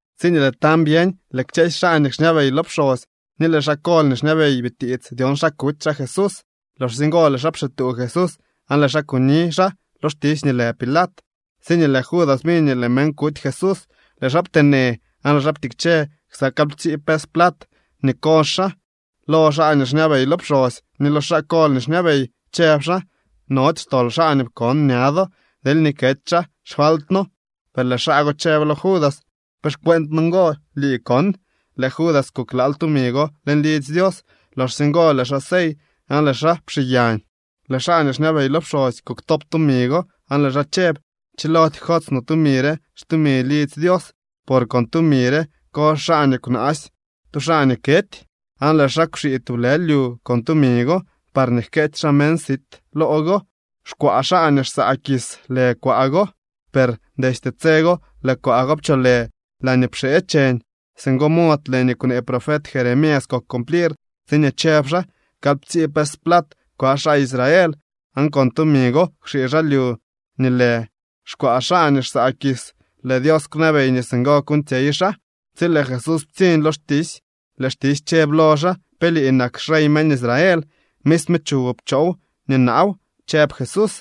Tsiñee lëë tañ byeñ, lëë kchësy xaa nii xñabey lo pxosy ni lëë xaa kol nii xñabey bitiits dyon xa kuty xaa Jesús. Loxsye ngo lëë xaa pxituu Jesús aan lëë xaa kuni xaa lo xtisy nii lë Pilat. Tsiñee lëë Judas biñ nii lëë meñ kuty Jesús, lëë xaa pteenë, aan lëë xaa ptikche ksa kalyptsii pes plat nii kozh xaa lo xaa nii xñabey lo pxosy ni lo xaa kol nii xñabey, chëb xaa: —Nody xtol xaa nii pkon ña do. Deelñee kety xaa xfaltno. Per lëë xaa go chëb lo Judas: —¿Pe xcueent noo ngo? ¡Lii kon! Lëë Judas kuklaal tumi go leñ lidzy Dios. Loxsye ngo lëë xaa sey aan lëë xaa pxiiyañ. Lëë xaa nii xñabey lo pxosy kuktop tumi go aan lëë xaa chëb: —Chilody jkots no tumi re xtumi lidzy Dios, por con tumi re kozh xaa nii kwnaasy tu xaa nii kety. Aan lëë xaa kwxii tublë lyu con tumi go parñee jkeetsy xaa meñ sit loo go. Xkwaa xaa nii xsaa kis lë kwaa go. Per destye tse go lëë kwaa go pcholë “Laañee pxee cheñ.” Singo mod lëë nii kwnee profet Jeremías kok cumplir tsiñee chëb xaa: “Kalyptsii pes plat kwaa xaa Israel, aan con tumi go kwxii xaa lyu nii lë xkwaa xaa nii xsaa kis. Lëë Dios kwnabey nii singo kuuñtsyey xaa.” Tsi lëë Jesús ptsiñ lo xtisy lëë xtisy chëb lo xaa: —¿Pe lii nak xrey meñ Israel? —Misme chuwoo pchoo nii naaw —chëb Jesús.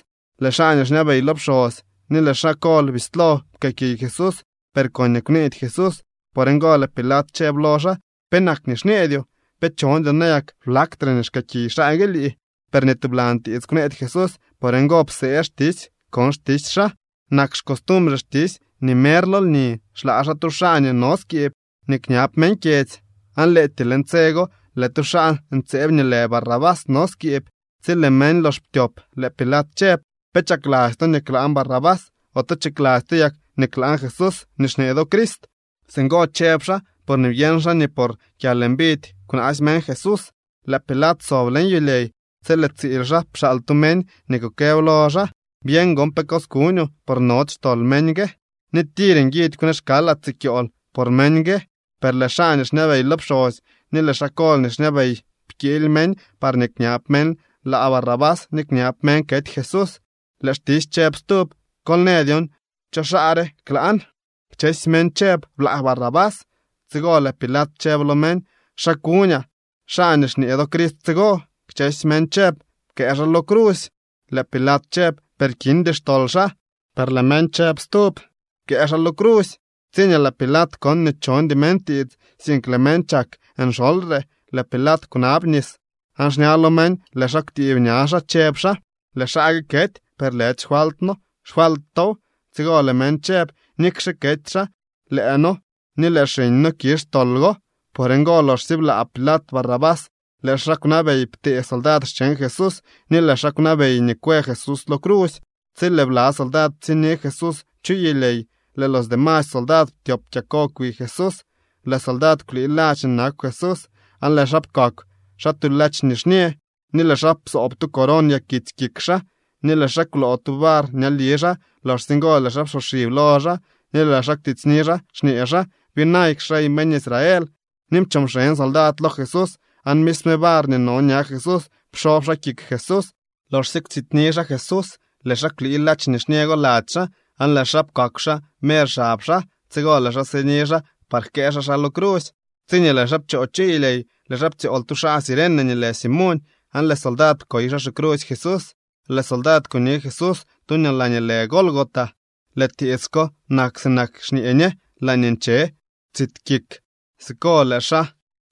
Lëë xaa nii xñabey lo pxosy ni lëë xaa kol bislo pkëëkiy Jesús, per koñee kwneedy Jesús. Por ngo lëë Pilat chëb lo xaa: —¿Penak nii xñeedyoo? ¿Pe chondyoo nayak blaktre nii xkëëkiy xaa gue lii? Per ni tublan tiits kwneedy Jesús. Por ngo psee xtisy kon xtisy xaa. Nak xcostumbre xtisy nii mer lo lni xlaa xaa tu xaa nii no skiib nii kñab meñ kyedzy. Aan lëëtyee leñ tse go lëë tu xaa ntseeb nii lë Barrabás no skiib. Tsi lëë meñ lox ptyop, lëë Pilat chëb: —¿Pe chakladzy to nii klaan Barrabás, ote chakladzy to yak nii klaan Jesús nii xñee do Crist? Singo chëb xaa porñee byeñ xaa nii por kyalmbidy kwnaasy meñ Jesús. Lëë Pilat sob leñ yulyey tsi lëë tsiil xaa pxaal tu meñ nii kukëb lo xaa: “Byeñ gon pe cos kuñoo, por nody xtol meñ gue, ni tir nguidy kwnee xkaalaa tsi kyool por meñ gue.” Per lëë xaa nii xñabey lo pxosy ni lëë xaa kol nii xñabey pkiily meñ parñee kñab meñ laa Barrabás ni kñab meñ kety Jesús. Lëë xtisy chëb stub: —Kol në dyon cho xaa re klaan. Kchësy meñ chëb: —Blaa Barrabás. Tsigo lëë Pilat chëb lo meñ: —¿Xa kuñaa xaa nii xñee do Crist tsigo? Kchësy meñ chëb: —¡Pkëë xaa lo crusy! Lëë Pilat chëb: —Per kindy xtol xaa. Per lëë meñ chëb stub: —¡Pkëë xaa lo crusy! Tsiñee lëë Pilat kon nii chondy meñ tiits, sink lëë meñ chak nxolyre, lëë Pilat kwnab nis aan xña lo meñ lëë xaa kwtiib ña xaa, chëb xaa: —Lëë xaa gue kety, per lëdy xfaltno, xfalt tow. Tsigo lëë meñ chëb: —¡Nikxe kety xaa, lëë noo ni lëë xiñ noo kizh tol go! Por ngo loxsye blaa Pilat Barrabás lëë xaa kwnabey ptee soldad xcheñ Jesús ni lëë xaa kwnabey nii kwë Jesús lo crusy. Tsi lëë bla soldad ptsiñni Jesús chu yulyey lëë los demasy soldad ptyop kyako kwi Jesús. Lëë soldad kwlii ladx nii nakw Jesús, aan lëë xaa pkakw xaa tu ladx nixñë, ni lëë xaa psoob tu coron yakitsy kik xaa, ni lëë xaa kwloo tu var ñali xaa. Loxsye ngo lëë xaa psoxib lo xaa ni lëë xaa kwtsityni xaa, xñee xaa: —¡Byinayk xrey meñ Israel! Ni pchoo mxeñ soldad lo Jesús, aan misme var nii no ña Jesús psob xaa kik Jesús. Loxsye kwtsityni xaa Jesús, lëë xaa kwlii ladx nixñë go lady xaa aan lëë xaa pkakw xaa mer xab xaa. Tsigo lëë xaa sini xaa par jkëë xaa xaa lo crusy. Tsiñee lëë xaa pchoo chu yulyey lëë xaa ptsyool tu xaa Cirene nii lë Simoñ. Aan lëë soldad pkoy xaa xicrusy Jesús. Lëë soldad kuni Jesús tu laañee lë Gólgota. (Lëë tiits ko nak sinak nii xñee ñe: Laañee nche tsit kik.) Siko lëë xaa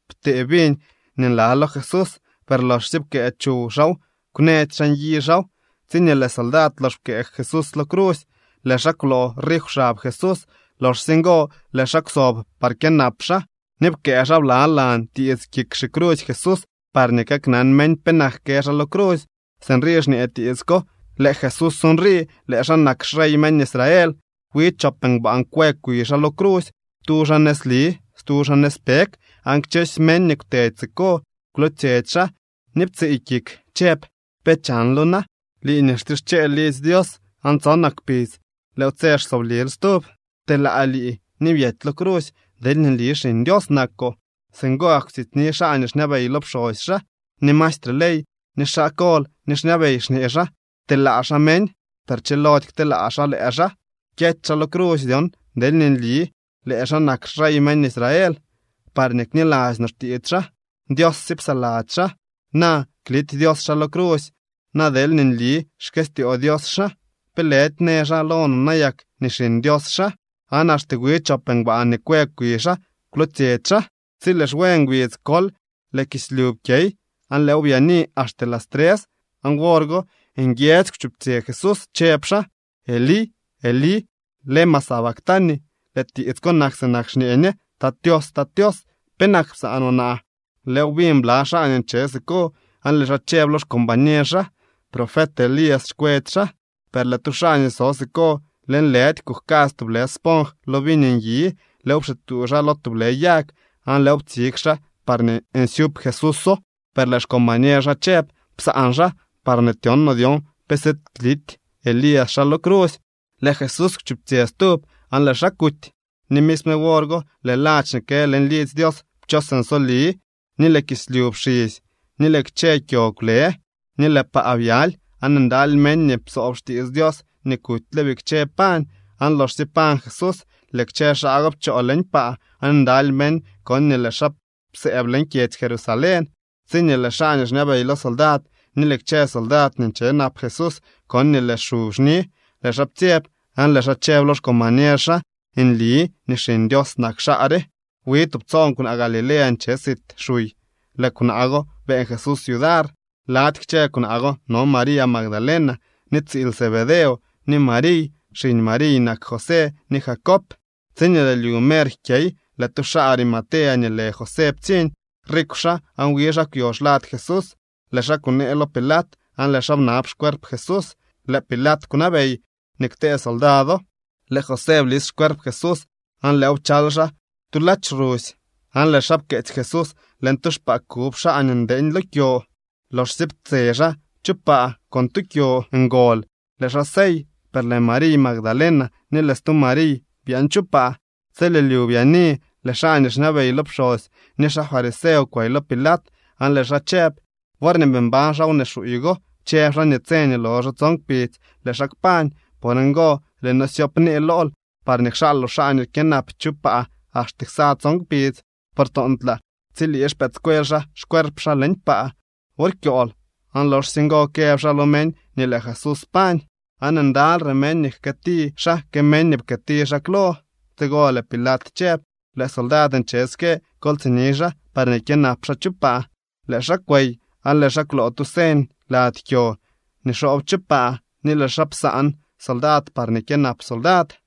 ptee viñ nii nla lo Jesús. Per loxsye pkëë chuw xaaw, kwnëdy xaa nyi xaaw. Tsiñee lëë soldad lox pkëë Jesús lo crusy, lëë xaa kwloo rif xab Jesús. Loxsye ngo lëë xaa kwsob par kyënap xaa. Ni pkëë xaa blalan tiits kik xicrusy Jesús parñee kaknan meñ penak kë xaa lo crusy. Sinrii xñee tiits ko: “Lëë Jesús nrii. Lëë xaa nak xrey meñ Israel.” Wi chop ngbaan kwë kwi xaa lo crusy, tu xaa nëzli, stu xaa nëzpeg. Aan kchësy meñ nii kwtedy siko kwlootsyetsy xaa ni ptsiiy kik chëb: —¿Pe chanlo na?, lii nii xtischeel lidzy Dios aan tsonak kpidz lëëw tse xsooblil stub. Pteelaa lii ni byety lo crusy deelñee nli Xiñ Dios nakoo. Singo gak kwtsityni xaa nii xñabey lo pxosy xaa, ni maestre ley, ni xaa kol nii xñabey, xñee xaa: —Pteelaa xaa meñ, per chilody kteelaa xaa lëë xaa. Kyety xaa lo crusy dyon deelñee nli lëë xaa nak xrey meñ Israel, parñee kniladzy no xtiits xaa. Dios sye psaladzy xaa, na klity Dios xaa lo crusy na deelñee nli xkëstyoo Dios xaa. ¿Pe lëdy në xaa lo no nayak nii Xiñ Dios xaa? Aan axte wi chop ngbaan nii kwë kwi xaa kwlootsyetsy xaa. Tsi lëë xwe ngbidz kol lëë kislyu pkyey aan lëëw byaani axte las tres. Aan wor go nguiedzy kwchuptsyë Jesús, chëb xaa: —Elí, Elí, ¿lema sabactani? (Lëë tiits ko nak sinak xñee ñe: Tat Tios, Tat Tios, ¿penak psaanoo naa?) Lëëw biñ bla xaa nii nche siko aan lëë xaa chëb lo xcombañer xaa: —Profet Elías xkwetsy xaa. Per lëë tu xaa nii so siko lëënlëdy kujkadz tublë sponj lo viñ nyi. Lëëw pxituu xaa lo tublë yag, aan lëëw ptsig xaa parñee nsyup Jesúso. Per lëë xcombañer xaa chëb: —Psaan xaa parñee tyon no dyon pe siid klity Elías xaa lo crusy. Lëë Jesús kwchuptsyë stub, aan lëë xaa kuty. Ni misme wor go lëë ladx nii kë leñ lidzy Dios pchos nsoli, ni lëë kislyu pxisy, ni lëë kchë kyo kwlë, ni lëë paa byaly. Aan ndaly meñ nii psoob xtiits Dios nii kutyle bikche pañ. Aan loxsye pañ Jesús, lëë kchë xaa go pchoo leñ paa, aan ndaly meñ kon nii lëë xaa psëëb leñ kyedzy Jerusalén. Tsiñee lëë xaa nii xñabey lo soldad ni lëë kchë soldad nii nche nap Jesús kon nii lëë xu xni, lëë xaa ptsyeb aan lëë xaa chëb lo xcombañer xa: —Nli nii Xiñ Dios nak xaa re. Wi tubtsoon kwnaa Galilea nche sit xuy. Lëë kwnaa go beeñ Jesús yudar. Lady kchë kwnaa go no María Magdalena, ni tsiil Zebedeo, ni Mariy. Xiñ Mariy nak José ni Jacob. Tsiñee lëë lyu mer jkyey, lëë tu xaa Arimatea nii lë José ptsiñ. Rikw xaa aan wi xaa kwyo xlad Jesús. Lëë xaa kunee lo Pilat aan lëë xaa bnab xcuerp Jesús. Lëë Pilat kwnabey nii ktee soldado. Lëë José blis xcuerp Jesús, aan lëëw pchal xaa xaa tu ladx rusy, aan lëë xaa pkeetsy Jesús leñ tu xpaa kub xaa nii ndeeñ lo kyo. Loxsye ptse xaa chu paa con tu kyo ngol, lëë xaa sey. Per lëë María Magdalena ni lëë stu Mariy byaan chu paa. Tsi lëë lyu byaani lëë xaa nii xñabey lo pxosy ni xaa fariseo kwey lo Pilat aan lëë xaa chëb: —Worñee bii mbañ xaa wnee xuuy go, chëb xaa nii tse nii loxo tson kpidz lëë xaa kpañ. Por ngo, lëë noo syoopnee lool parñee kxaaloo xaa nii kyënap chu paa axte ksa tson kpidz. Por toontlaa tsilii xpëëdscuel xaa xcuerp xaa leñ paa wor kyool aan loxsye ngo këb xaa lo meñ nii lëë Jesús pañ. Aan ndalyre meñ nii jkëëti xaa que meñ nii pkëëti xaa klo. Tsigo lëë Pilat chëb: —Lëë soldad nche ske. Kol tsini xaa parñee kyënap xaa chu paa. Lëë xaa kwey, aan lëë xaa kwloo tu señ lady kyo nii xoob chu paa, ni lëë xaa psaan soldad parñee kyënap soldad.